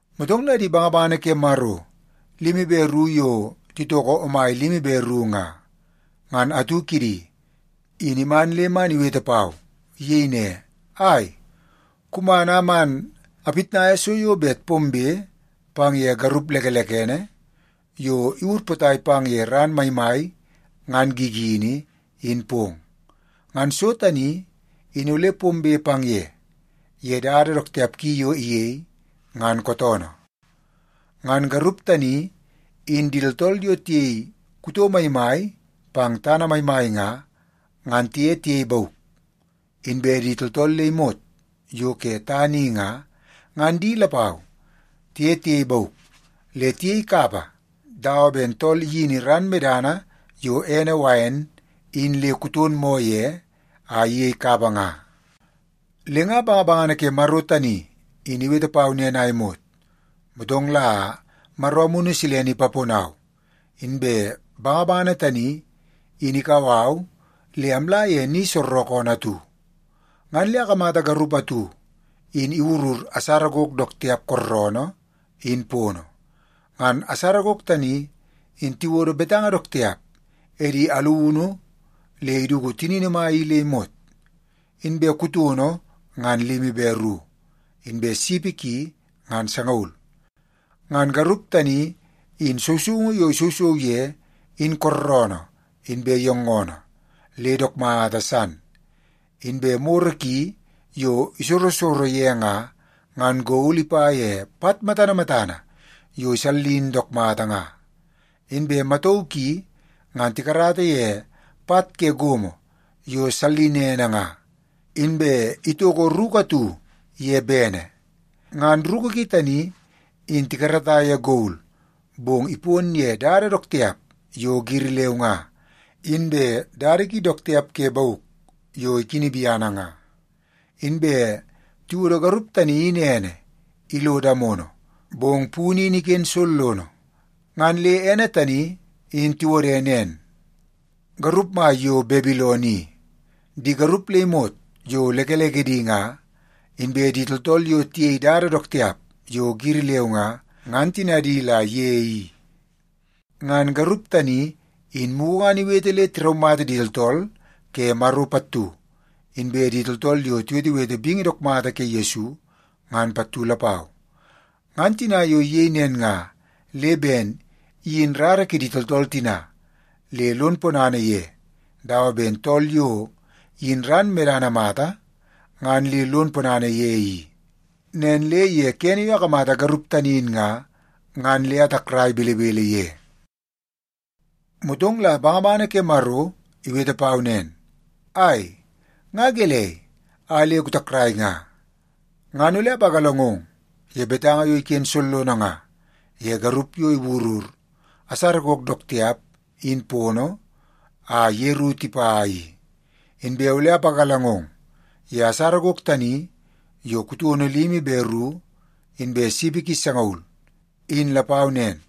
Motong la di bangabangana ke Maro limi be ru yo titoko omai limi be ru nga, ngan atu kidi in iman le man iwete pau. Iyei ne, “Ai, kuman a man apitnaia so yo bet pombe pang ye garup lekelekene yo iwur potai pang ye ran maimai ngan gigini, in pong. Ngan so tani in ole pombe pang ye, ye dada dook tiap ki yo iyei, ngan kootoonoo. Ngan garup tani in di tooltool yo tiyei kuto maimai pang tana maimai nga, ngan tiye tiyei bauk. Inbe di tooltool le imot yo ke tana i nga, ngan di lapau tiye tiyei bauk le tiyei kapa dawa ben tool iyini ran medana yo ene wain in le kuton moo ye a iyei kapa nga.” Le nga bangabangana ke Maro tani in iwete pau nen a imot, motong la Maro Amunu Silene ipaponau, inbe bangabangana tani in ikau au le amla ye ni soorookoonoo atu. Ngan le akamata garup atu in iwurur asara gok dook tiap kooroonoo in pono. Ngan asara gok tani, in tiwodo betanga dook tiap edi alunu le iduku tinini mai i le imot. Inbe kutono ngan limi be ru, inbe sipi ki ngan sangaul. Ngan garup tani in sousoungu yo isousou ye in kooroonoo inbe yoongoonoo le dook mata san. Inbe moro ki yo isorosoro ye nga, ngan gol ipa ye pat matana matana yo isallin dook mata nga. Inbe matauu ki ngan tikarata ye pat ke gomo yo sallinene nga. Inbe itoko ruku atu ye bene. Ngan ruku ki tani in tikarata ye gol, bong ipon ye dada dook tiap yo giri leu nga, inbe dada ki dook tiap ke bauk yo ikini biana nga. Inbe tiwodo garup tani in ene ilo damono, bong punu in iken sollono. Ngan le ene tani in tiwode nen: Garup Mai yo Babilon i. Di garup le imot yo lekelekedi nga, inbe di tooltool yo tiyei dada dook tiap yo giri leu nga, ngan tinadi la ye i. Ngan garup tani in mugu ngan iwete le tiraumata di tooltool ke Maro pattu, inbe di tooltool yo tiwetewete bingi dook mata ke Yesu, ngan pattu lapau. Ngan tina yo iyei nen nga, le ben iyin rara kidi tooltool tina le lon ponana ye dawa ben tool yo iyin ran medana mata ngan le lon ponana ye i. Nen le ye kene yo akamata garup tani in nga, ngan le atakrai belebele ye. Motong la bangabangana ke Maro iwete pau nen, “Ai, nga gelei a le kutakrai nga? Ngan ole apagalangong ye betanga yo iken sollono nga ye garup yo iwurur asara gok dook tiap in pono a yeru tipa i. Inbe ole ipagalangong ye asara gok tani yo kutono limi be ru inbe sipi ki sangaul, in lapau nen.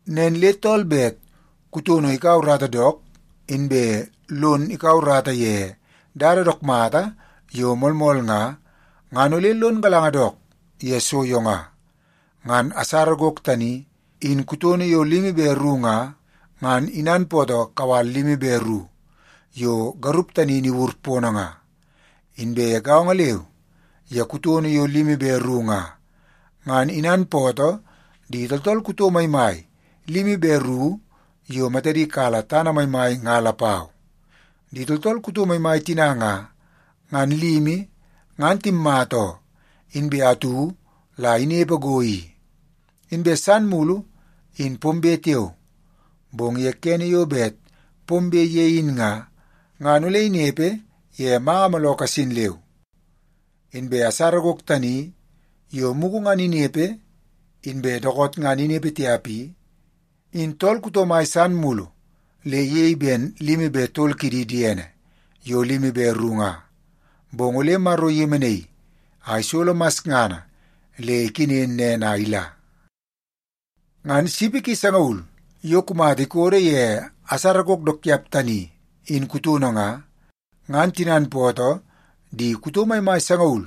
“Nen le tool bet kuton kaua urata dook, inbe lon kaua urata ye dada dook mata yo moolmool nga, ngan ole lon galanga dook ye so yo nga. Ngan asara gok tani in kutono yo limi be ru nga, ngan inanpootoo kawal limi be ru yo garup tani in iwur pono nga. Inbe gaongo leu ye kutono yo limi be ru nga, ngan inanpootoo di tooltool kuto maimai limi be ru yo matadi kala tana maimai nga lapau. Di tooltool kuto maimai tina nga, ngan limi ngan timmata oo, inbe atu la inepe go i. Inbe san mulu in pombe tiao, bong ye kene yo bet pombe ye in nga, ngan ole inepe ye manga mooloo kasin leu. Inbe asara gok tani yo mugu ngan inepe inbe dookoot ngan inepe tiap i, in tool kuto mai san mulu le iyei ben limi be tol kidi diene yo limi be ru nga. Bong ole Maro iyemenaii a isolo masngana le ikenen nen a ila. “Ngan sipi sangaul yo kumata ikodo ye asara gok dook tiap tani in kutono nga, ngan tinanpootoo di kuto maimai sangaul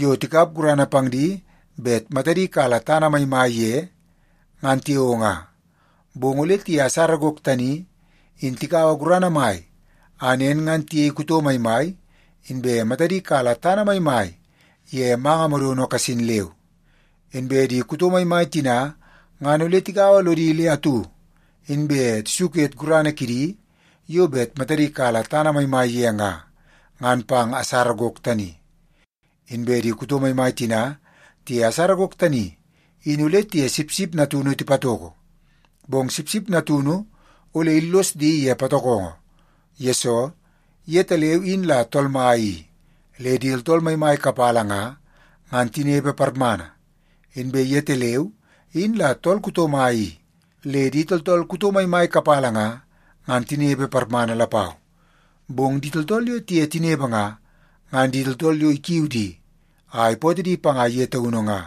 yo tikap gurana pang di bet matadi kala tana maimai ye, ngan tiao nga. Bong ole tiye asara gok tani in tikaua gurana mai a nen ngan tiyei kuto maimai, inbe matadi kala tana maimai ye manga modono kasin leu. Inbe di kuto maimai tina ngan ole tigaua lodi le atu, inbe tisuket gurana kidi yo bet matadi kala tana maimai ye nga, ngan pang asara gok tani. Inbe di kuto maimai tina tiye asara gok tani in ole tiye Sipsip Natunu tipatoko. Bong Sipsip Natunu ole illos di ye patokongo, yesoo yetaleu in la Tool Mai i, le di tooltool maimai kapala nga, ngan tinepe parmana. Inbe yetaleu in la Tool Kuto Mai i, le di tooltool kuto maimai kapala nga, ngan tinepe parmana lapau. Bong di tooltool yo tiye tinepe nga, ngan di tooltool yo ikiu di a ipootoo di panga ye taunu nga,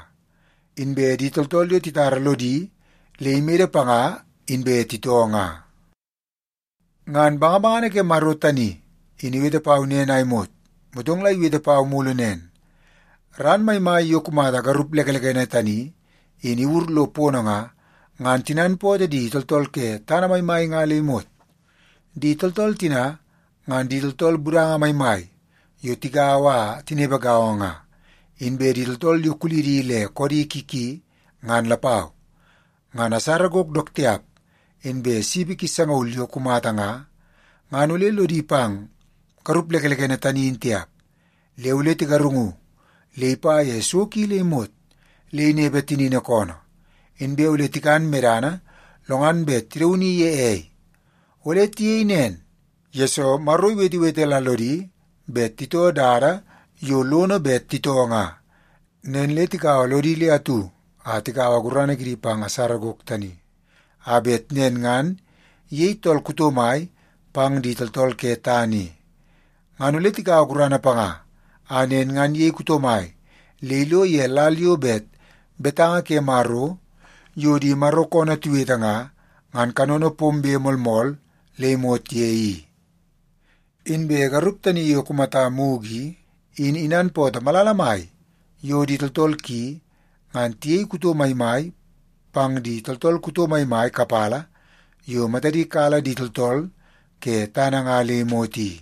inbe di tooltool yo titara lodi le imede panga inbe titoo nga.” Ngan bangabangana ke Maro tani in iwete pau nen a imot, motong la iwete pau mulu nen, “Ran maimai yo kumata garup lekelekene tani in iwur lo pono nga, ngan tinanpootoo di tooltool ke tana maimai nga le imot. Di tooltool tina ngan di tooltool budanga maimai yo tigaua a tinepe gaongo nga, inbe di tooltool yo kulidi le koodi ki ki ngan lapau. Ngan asara gok dook tiap inbe sipi ki sangaul yo kumata nga, ngan ole lodi pang garup lekelekene tani in tiap. Le ole tigarungu le ipa ye so ki le imot le inepe tinini koonoo. Inbe ole tikan medana lo ngan bet tidauni ye ei. Ole tiyei nen, yesoo Maro iwetewete la lodi bet titoo dada yo lono bet titoo nga. Nen le tigaua lodi le atu a tikaua gurana kidi pang asara gok tani, a bet nen ngan iyei tool kuto mai pang di tooltool ke tana i. Ngan ole tikaua gurana panga a nen ngan iyei kuto mai le ilo ye lal yo bet betanga ke Maro yo di Maro koonoo tiwete nga, ngan kanono pombe moolmool le imot ye i. Inbe garup tani yo kumata mugu i, in inanpootoo malala mai yo di tooltool ki ngan tiyei kuto maimai pang di tooltool kuto maimai kapala yo matadi kala di tooltool ke tana nga le imot i.”